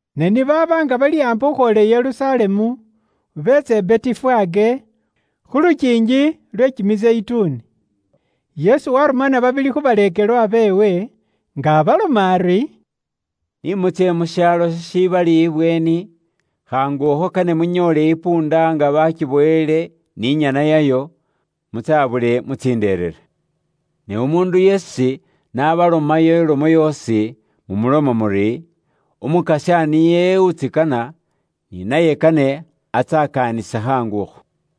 Ne ni baaba nga bali aambi khukhwoola i Yerusalemu, beetsa i Betifage, khu lukiingi lwe Kimizeyituni. Yesu warumana babili khu baleekelwa beewe, nga abaloma ari, Ni mutsye mu shaalo shishibali ibweeni, khaangu akho kane munyoole isikilya nga baakibowele ni nyana yayo. Mutsabule, mutsinderere. Ne umuundu yeesi n'abalomayo ilomo yoosi, mumuloma muri, “Umukasya niye utsikana, ni naye kane atsakaanise khaangu akho.”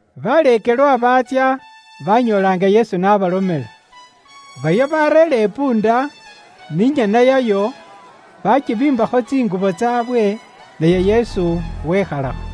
Baleekelwa baatsya, baanyoola nga Yesu n'abalomela. Baryo baareera isikilya, ni nyana yayo, baatsibiimbakho tsingubo tsaabwe, naye Yesu wekhalakho.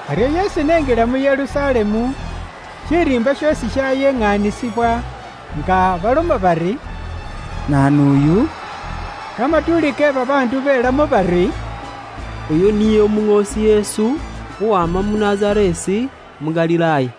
Aryo Yesu ni enjila mu Yerusalemu, shiriimba shoosi shayeŋanisibwa, nga baloma bari, “Naanu uyu?” Kamatuuli ke babaandu belamo bari, “Oyu niye Umuŋoosi Yesu, uwama mu Nazareesi mu Galilaaya.”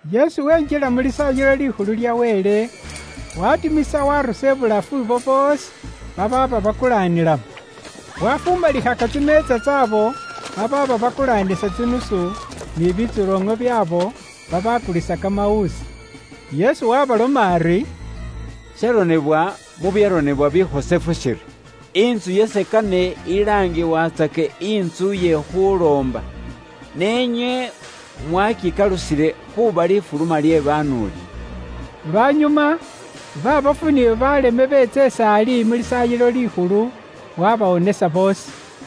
Yesu wenjila mu Lisaayilo Likhulu lya Wele, waatimisa waarusa ibulafu ibo boosi babaaba bakulaanilamo. Waafumalikhaka tsimeetsa tsaabo babaaba bakulaanisa tsinusu, ni bitsoloŋo byaabo babaakulisa kamawuusi. Yesu waabaloma ari, “Sharonebwa mu byaronebwa bikhosefu shiri, ‘Intsu yase kane ilaangibwatsake intsu iye khuloomba, ne inywe mwakikalusile khuuba lifuluma lye banuuli.’” Lwanyuma, baabofu ni baaleme beetsa is'ali mu Lisaayilo Likhulu, waabawonesa boosi.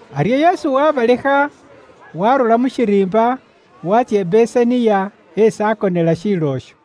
Aryo Yesu waabalekha, waarura mu shiriimba, waatsya i Besaniya esi akonela shiilo isho.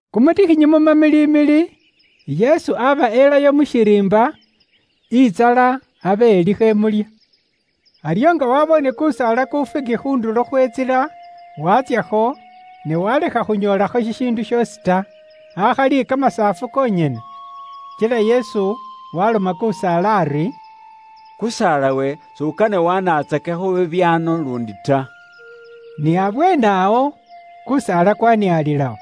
Kumutikhinyi mu mamilimili, Yesu aaba elayo mu shiriimba, intsala abe ilikho imulya. Aryo nga waaboone kusaala ku Figi khu ndulo khwe ntsila, watsyakho, ne waalekha khunyoolakho shishiindu shoosi ta, akhali kamasaafu konyene. Kila Yesu waaloma kusaala ari, “Kusaalawe, s'ukane waanatsakekho bibyaano luundi ta.” Ni abweene awo, kusaala kwaaniaalilawo.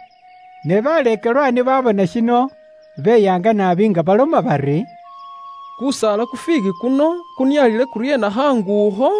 Ne baleekelwa ni baabona shino beyaanga naabi nga baloma bari, “Kusaala ku figi kuno kunialile kuryeena khaangu akho?”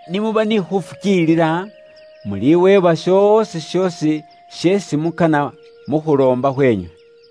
Ni muba ni khuufukiilila, muliweebwa shoosi shoosi sheesi mukana mu khuloomba khweenywe.”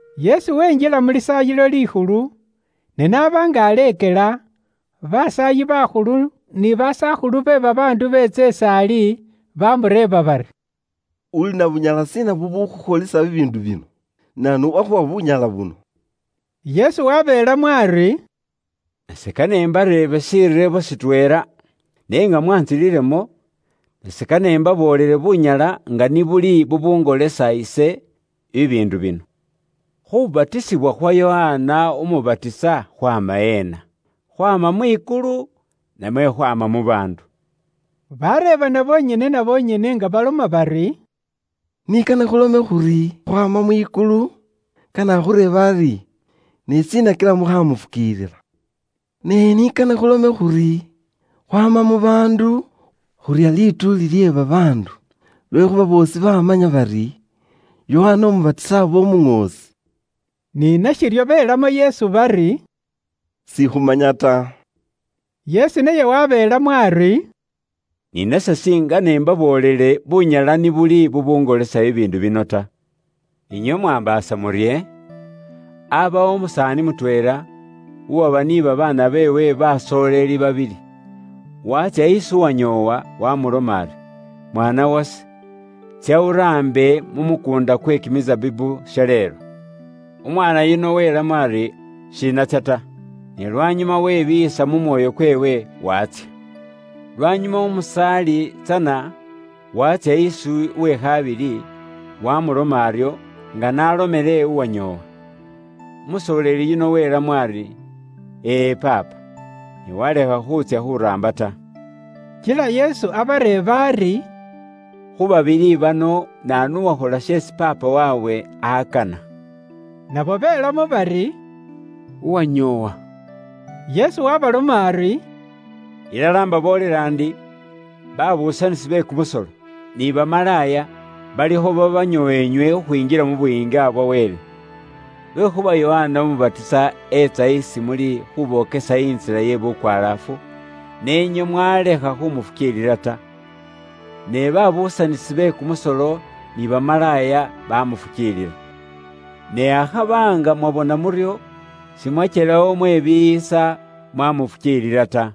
Yesu wenjila mu Lisaayilo Likhulu, ne n'aba nga aleekela, basaayi bakhulu ni basakhulu be babaandu beetsa is'ali, bamureeba bari, “Uli na bunyala shiina bubukhukholisa bibiindu bino? Naanu uwakhuwa bunyala buno?” Yesu wabeelamo ari, “Nase kane imbareebe shireebo shitweela. Ne nga mwantsililemo, nase kane imbaboolele bunyala nga ni buli bubungolesa ise bibiindu bino. Khubatisibwa khwa Yokana Umubatisa khwaama eena? Khwaama mwikulu namwe khwaama mu baandu?” Baareebana bonyene na bonyene nga baloma bari, “Ni kane khulome khuri, khwaama mwikulu, kane akhureebe ari, ‘Ne shiina kila mukhaamufukiilila?’ Ne ni kane khulome khuri, khwaama mu baandu, khurya lituuli lye babaandu, lwekhuuba boosi baamanya bari, Yokana Umubatisa aaba umuŋoosi.” Ni nashiryo beelamo Yesu bari, “Sikhumanya ta.” Yesu naye wabeelamo ari, “Ni nase singene imbaboolele bunyala ni buli bubuungolesa bibiindu bino ta.” “Inywe mwaambaasa murye? Aabawo umusaani mutweela, uwaba ni babaana beewe basooleli babili. Waatsya isi unyoowa waamuloma ari, ‘Mwaana wase, tsya uraambe mu mukuunda kwe kimisabibu shaleelo.’ Umwaana yuno welamo ari, ‘Shinatsya ta.’ Ne lwanyuma webiiyisa mu mwoyo kweewe, waatsya. Lwanyuma umusaali tsana waatsya isi uwe khabili, waamulomela aryo, nga n'alomela uwanyoowa. Umusooleli yuno welamo ari, ‘E e paapa.’ Ne walekha khuutsya khuraamba ta.” Kila Yesu abareeba ari, “Khu babili bano, naanu uwakhola sheesi paapa waabwe akana?” Nabo belamo bari, “Uwanyoowa.” Yesu waabaloma ari, “Ilala imbaboolela ndi, babuusanisi be kumusolo, ni bamalaaya balikho babanyoowa inywe khukhwinjila mu Buyiinga bwa Wele. Lwekhuuba Yokana Umubatisa etsa isi muli khubokesa intsila ye bukwalaafu, ne inywe mwalekha khumufukiilila ta, ne babuusanisi be kumusolo ni bamalaaya bamufukiilila. Ne akhaba nga mwabona muryo, simwakyelawo mwebiiyisa, mwamufukiilila ta.”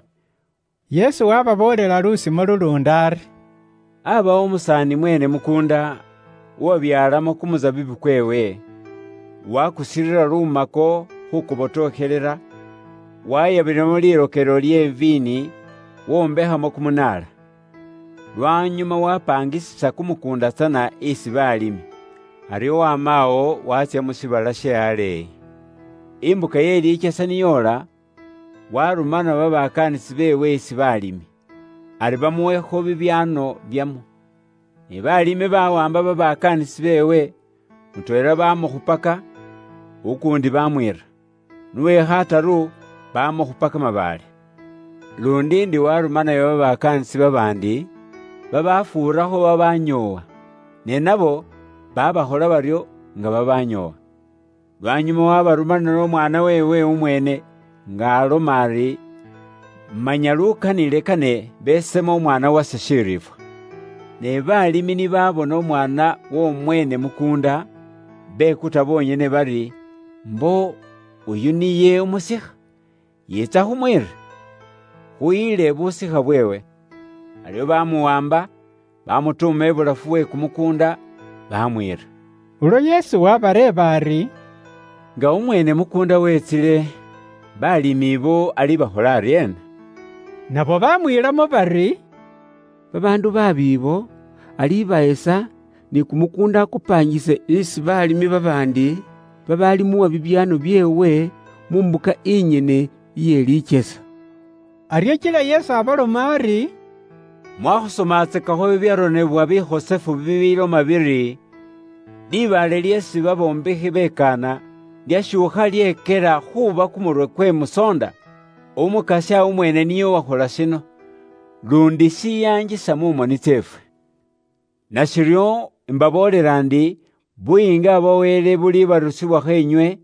Yesu waababoolela lusimo luluundi ari: “Aabawo umusaani mweene mukuunda, uwabyaalamo kumusabibu kweewe. Waakusirira lumako khuukubotokhelela, wayabilamo lirokelo lye viini, wombekhamo kumunaala. Lwanyuma wapaangisisa kumukuunda tsana isi baalimi, aryo waamawo, waatsya mu shiibala she aleeyi. Imbuka ye likyesa ni yoola, waarumana babakaanisi beewe isi baalimi, ari bamuwekho bibyaano byamwo. “Ne baalimi bawaamba babakaanisi beewe, mutweela baamukhupaka, ukuundi baamwiira, n'uwe khataru baamukhupa kamabaale. Luundi ndi waarumanayo babakaanisi babaandi, babafuurakho babaanyoowa. Ne nabo baabakhola baryo nga babaanyoowa. Lwanyuma waabarumanila umwaana weewe umweene, nga aloma ari, ‘Manya lukanile kane besemo umwaana wase shiriifwa.’ “Ne balimi ni baabona umwaana w'omweene mukuunda, bekuta bonyene bari, ‘Mbo oyu niye umusikha, yiitsa khumwiire, khuyile busikha bweewe.’ Baryo baamuwaamba, baamutuuma ibulafu we kumukuunda, baamwiira.” Ulwo Yesu waabareeba ari, “Nga umweene mukuunda weetsile, baalimi abo alibakhola aryeena?” Nabo baamwiilamo bari, “Babaandu baabi abo, alibahesa, ni kumukuunda akupaangise isi balimi babaandi, babaalimuwa bibyaano byeewe mu mbuka inyene iye likyesa.” Aryo kila Yesu abaloma ari: “Mwaakhusomatsakakho bibyaronebwa bikhosefu bibiloma biri, ‘Libaale lyeesi babombekhi bekaana, lyashuukha lyekyela khuuba kumurwe kwe musoonda. Umukasya umweene niye uwakhola shino, luundi shiyaangisa mu moni tseefwe.’ “Nashiryo, imbaboolela ndi, Buyiinga bwa Wele bulibarusibwakho inywe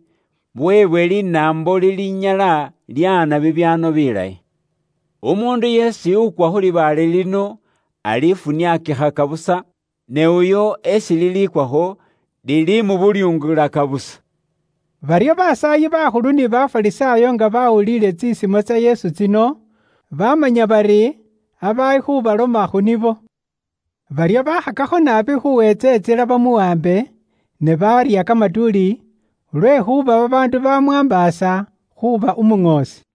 buweebwe linaambo lilinyala lyaana bibyaano bilayi. Umuundu yeesi ukwa khu libaale lino alifuniakikhaka busa, ne uyo esi lilikwakho, lilimubulyungulaka busa.” Baryo basaayi bakhulu ni Bafarisaayo nga baawuliile tsisimo tsa Yesu tsino, baamanya bari aaba ali khuubaloma khu nibo. Baryo baakhakakho naabi khuuweentsa imbuka bamuwaambe, ne baarya kamatuuli lwekhuuba babaandu bamwaambaasa khuuba umuŋoosi.